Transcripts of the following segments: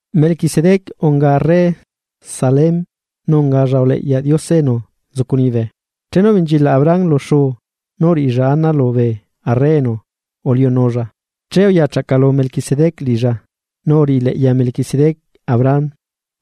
Melquisedec unga arre Salem nu ungalla uleꞌyaꞌ Diose enu nzucu liñibe. Chenu ubenchilaꞌ Abraham lu xuu nú uriꞌilla ana lubee arre enu uliunulla, che uya chaꞌcalu Melquisedec liꞌilla, nu uriꞌi leꞌya Melquisedec Abraham.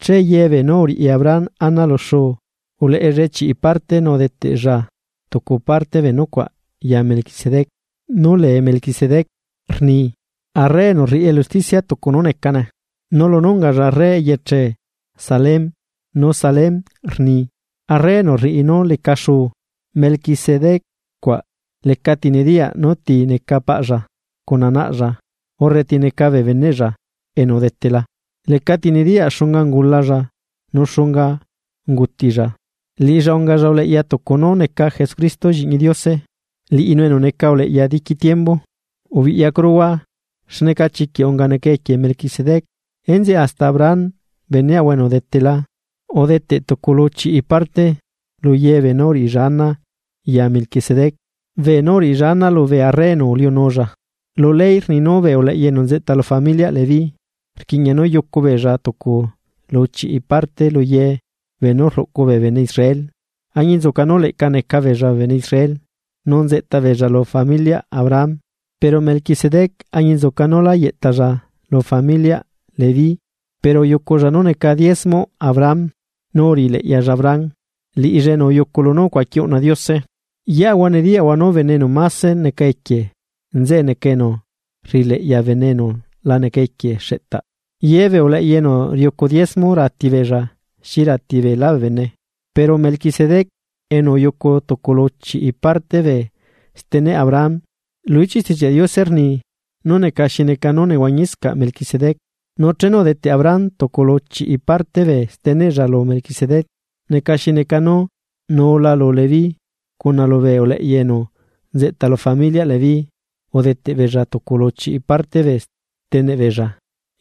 Che yebeenú uriꞌi Abraham ana lu xuu, uleꞌellae chiꞌi parte nu udeteꞌlla tucu parte bee nucuaꞌ ya Melquisedec. Nú lee Melquisedec rni “arre enu rriꞌi elu usticia tucu nú necane”. Nu lunú ungalla arre eyeche Salem, nu Salem rni “arre enu rriꞌi nú leca xuu”. Melquisedec cuaꞌ lecati nediyaꞌ nú ti neca paꞌlla cuna naꞌlla urre ti neca bee beneꞌlla enu udetela. Lecati nediyaꞌ xunga ungulalla nu xunga ungutilla. Liꞌilla ungalla uleꞌya tucu nú neca Jesucristo lliꞌñi Diose, liꞌinu enu neca uleꞌya diqui tiembu. Ubiꞌyacuruhua xneca chiquiꞌ unga neca equie Melquisedec. Enzeꞌe hasta Abraham beneꞌahua enu udetela, udeteꞌ tucu lu chiꞌi parte luyebeenú uriꞌilla ana ya melquisedec beenú uriꞌilla ana lubee arre enu uliunulla. Lu ley rni nú bee uleꞌya enu nzeꞌta lu familiaꞌ Leví rquiꞌña nú yucu beella tucu lu chiꞌi parte lu ye beenú rluꞌcu bee bene Israel añinzuca nú leꞌca neca beella bene Israel nu nzeꞌta beella lu familiaꞌ Abraham. Pero Melquisedec añinzuca nú lá yeꞌtalla lu familiaꞌ Leví, pero uyuculla nú neca diezmoꞌ Abraham. Nu uriꞌi leꞌyalla Abraham nu uyuculla lunú ucuaqui uꞌna Diose. Yeꞌahua nediyaꞌahua nú bene enu máse neca equie nzeꞌe neca enu rriꞌileꞌya bene enu la neca equie xeꞌtaꞌ. Yebee uleꞌya enu riucu diezmo ratibeella xi rati beelá bee bene. Pero Melquisedec enu uyucu tucu lu chiꞌi parte bee steneꞌ Abraham, lu ichiꞌ Stichiaꞌ Diose rni nú neca xi neca nú nehuañiscaꞌ Melquisedec. Nu chenu udeteꞌ Abraham tucu lu chiꞌi parte bee steneꞌlla lu Melquisedec neca xi neca nú nuula lu Leví cuna lubee uleꞌya enu nzeꞌta lu familiaꞌ Leví udeteꞌ beella tucu lu chiꞌi parte bee steneꞌ beella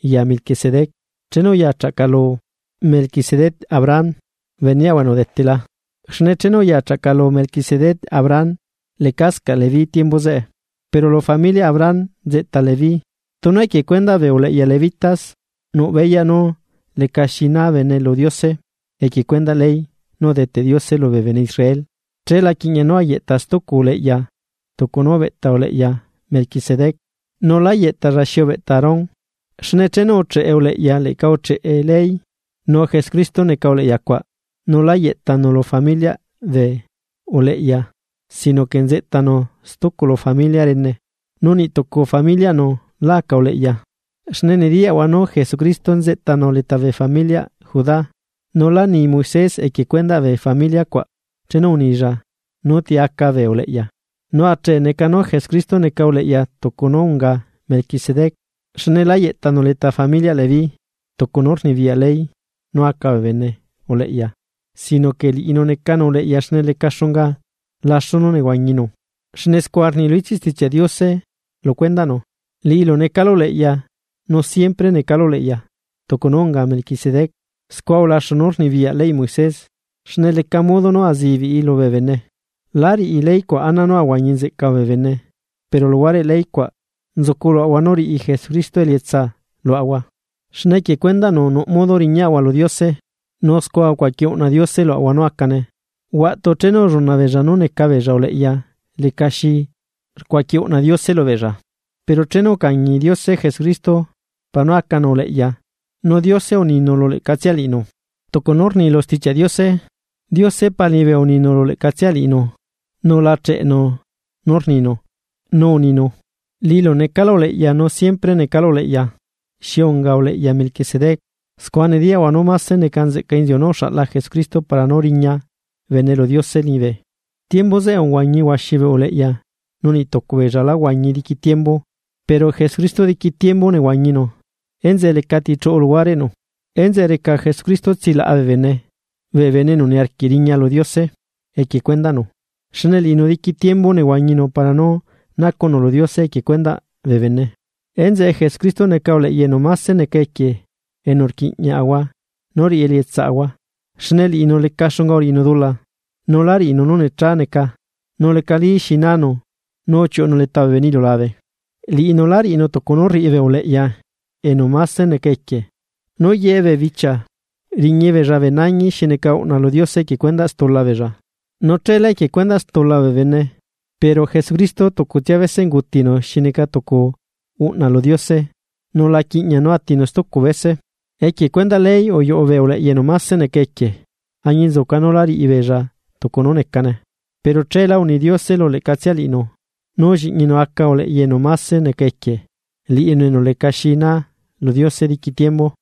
ya Melquisedec chenu uya chaꞌcalu Melquisedec Abraham beneꞌahua enu udetela. Xne chenu uya chaꞌcalu Melquisedec Abraham, lecascaꞌ Leví tiembu zeꞌe, pero lu familiaꞌ Abraham nzeꞌta Leví. Tunu equie cuendaꞌ bee uleꞌya Levítas nuꞌ beyaꞌ nú lecaxi na bene lu Diose equie cuendaꞌ ley nú udeteꞌ Diose lubee bene Israel che la quiꞌña nú ayeꞌta stucu uleꞌya tucu nú ubeꞌta uleꞌya Melquisedec nu lá yeꞌtalla xi ubeꞌta Aarón. Xne chenu ucheꞌe uleꞌya leꞌca ucheꞌe ley. Nu Jesucristo neca uleꞌya cuaꞌ nu lá yeꞌtanu lu familiaꞌ bee uleꞌya. Sino que nzeꞌtanu stucu lu familia rene, nu niꞌ tucu familiaꞌnu lá aca uleꞌya. Xne nediyaꞌahua nú Jesucristo nzeꞌtanu leta bee familiaꞌ Judá, nu lá ni Moisés equie cuendaꞌ bee familia cuaꞌ chenu unilla nú ti aca bee uleꞌya. Nu achee neca nú Jesucristo neca uleꞌya tucu nú unga Melquisedec. Xne lá yeꞌtanu leta familiaꞌ Leví, tucu nú rnibiyaꞌ ley nú aca bene uleꞌya sino que liꞌinu necanu uleꞌya xne leca xunga laxu nú nehuañinu. Xne scua rni lu ichiꞌ Stichiaꞌ Diose lu cuendaꞌnu: Liꞌilu necalu uleꞌya nu siempre necalu uleꞌya tucu nú unga Mequisedec. Scua ulaxu nú rnibiyaꞌ leyꞌ Moisés xne leca modo nú azibiꞌi lubee bene. Láriꞌi ley cuaꞌ ana nú ahuañi nzeꞌca bee bene. Pero luhuareꞌ ley cuaꞌ, nzucu luaꞌahua nú riꞌi Jesucristo elietsa luaꞌahua, xne equie cuendaꞌnu nuꞌ modo riñaꞌahua lu Diose. Nu scua ucuaqui uꞌna Diose luaꞌahua nú acane. Huaꞌtu chenu ulluna beella nú neca beella uleꞌya lecaxi rcuaqui uꞌna Diose lubeella. Pero chenu ucañi Diose Jesucristo, para nú acanu uleꞌya, nu Diose uninu lu leꞌcatsia Liꞌinu, tucu nú rni lu Stichiaꞌ Diose: Diose Pa liñibe uninu lu leꞌcatsia Liꞌinu, nu la cheꞌenu nú rninu, nu uninu: “Liꞌilu necalu uleꞌya nu siempre necalu uleꞌya, xi unga uleꞌya Melquisedec.” Scua nediyaꞌahua nú máse neca nzeꞌca inziu nú uxaꞌla Jesucristo para nú riña bene lu Diose liñibe. Tiembu zeꞌe uhuañi huaxi bee uleꞌya nu niꞌtucu beella lá huañi diqui tiembu. Pero Jesucristo diqui tiembu nehuañinu, enzeꞌe lecati chuꞌu luhuareꞌnu. Enzeꞌe reca Jesucristo tsilaꞌa bee bene, bee bene enu niarquiꞌ riña lu Diose equie cuendaꞌnu, xne liꞌinu diqui tiembu nehuañinu para nú nacuꞌnu lu Diose equie cuendaꞌ bee bene. Enzeꞌe Jesucristo neca uleꞌya enu máse neca equie enu rquiꞌñiaꞌahua nú riꞌi elietsaꞌahua, xne liꞌinu leca xunga uriꞌinu dula. Nu lá riꞌinu nú necha neca nu lecali xi nanu nu uchiuꞌunu leta bee bene iliulabe. Liꞌinu lá riꞌinu tucu nú rriꞌi bee uleꞌya enu máse neca equie, nú ye bee bichia riñi beella bee nañi xi neca uꞌna lu Diose equie cuendaꞌ stula beella. Nu chela equie cuendaꞌ stula bee bene. Pero Jesucristo tucutsia bese ungutinu xi neca tucu uꞌna lu Diose, nu la quiꞌña nú atinu stucu bese. Equie cuendaꞌ ley uyuꞌu bee uleꞌya enu máse neca equie, añinzuca nú lá riꞌi beella tucu nú necane. Pero cheelá uni Diose lu leꞌcatsia liꞌinu. Nú lliꞌñinu aca uleꞌya enu máse neca equie, liꞌinu enu lecaxi naa lu Diose diqui tiembu.